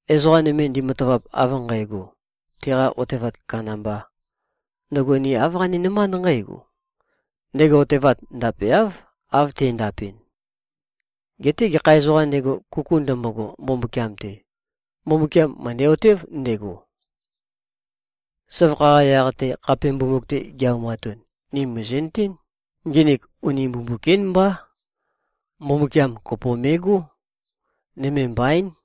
Ezoqa nøme ndematavap av nqægo, teqa otevat kandambā, ndøgo ni āv qaninømánd nqǽgo, ndego otevat ndapeáv, av te꞉ndapɨn. Geté gekha ezoqām ndego, kuku ndømbogo Mbumbukiam-te, Mbumbukiam mø̀ndæ-otév ndego. Søvakha-qa yaq-te, khape mbumbuk-te gi-aumatun, ni mìzi꞉nøtén, nginik uni mbumbuk-ín mbá. Mbumbukiam kopo me꞉gó. Nøme mbaín.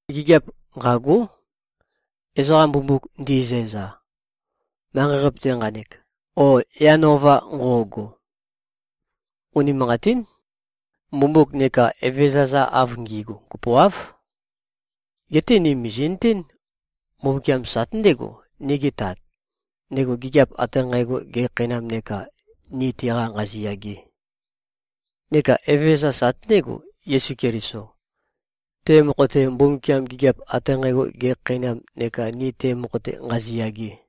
Gigiap nqâgó, ezoqa “mbumbuk” ndi꞉zæza, manqei-qape-te nqanek o yan ova nqo꞉go. Unimanqatín. Mbumbuk neka evezøza-za av ngi꞉gu kopoáv. Geté ni mìzi꞉nøtén, Mbumbukiam sate ndégo, nigi Tat, ndego gigiap ate nqægo gekhakheinam neka ni teqa nqaziyage. Neka Evezøza sate ndégo, Yesu Keliso, te mokho-te, Mbumbukiam gigiap ate nqægo gekhakheinam neka ni te mokho-te nqaziyage.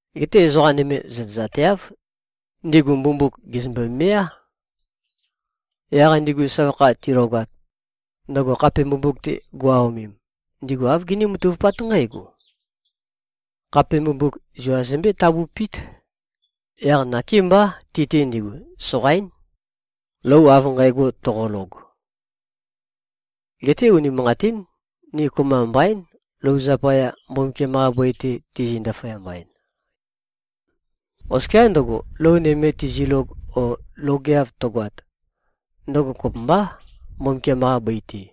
Geté ezoqa nøme zøtezateáv. Ndigu mbumbuk gèzømbe-meá. Yaq ndigu søvakha tilogat, ndøgo khape mbumbuk-te go꞉-aomem, ndigu āv giní-matavupát nqǽgo: Khape mbumbuk zua zømbé-tabupít. Yaq nakémbá, ti-te ndigu soqaín, lou av nqægo toqolog. Geté unimanqatín. Ni kopømba mbaín, lou zapaya, Mbumbukiam-qa bøi-te tizi-ndaføyamba-en. Oskiá ndøgo, lou nøme tizilog o logeav tøgoat, ndøgo kopømbá, Mbumbukiam-qa bøi-te.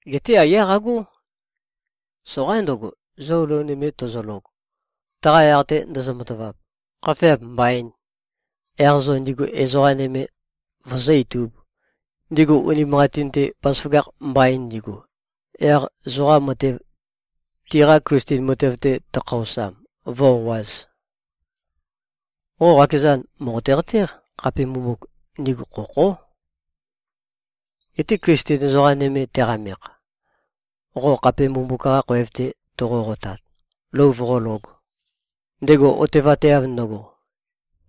Geté aiyá qagó. Soqaín ndøgo, zo lou nøme tozolog, taqa yaq-te ndozo-matavap, khafeap mbaīn, yaq zo ndigu ezoqa nøme vozó-itūb, ndigu unimanqatin-te bazaføgakh mbain ndigu, yaq zoqa matev, tiqa Klisten matev-te tøkhaosam, vǿ-o꞉āz. Qo qakezan mòqote-qatéq, khape mbumbuk, ndigu khokhó. Geté Klisten ezoqa nøme teqamekh, qo khape mbumbuk-qa khoev-te toqo-qotat, lou voqólōg, ndego otevateav ndøgo,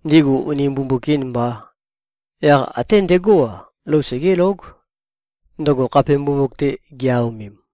ndigu uni mbumbuk-īn mbā, yaq até ndegó-a, lou segélóg, ndøgo khape mbumbuk-te gi-aomem.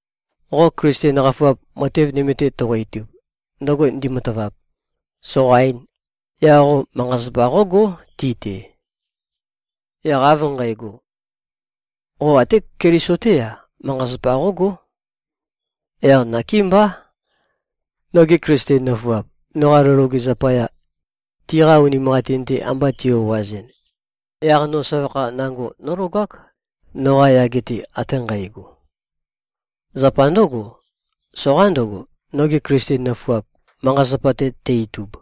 Qo Klisten qafuap, matev nøme-te toqo-itub, ndøgo ndi꞉matavap, soqaīn, yaq qo manqa-zapa qógó, ti-te. Yaq av nqægo, qo ate Keliso-té-a, manqa-zapa qógó. Yaq nakémbá, nogi Klisten nøfuap, noqa lou loge zapaya, tiqa unimanqatin-te amba ti-o꞉azɨn, yaq no søvakha nango nólogák, noqa yage-te ate nqægo. Zapa ndǿgo, soqaín ndøgo, nogi Klisten nøfuap, manqa-zapa-te tæ-itub.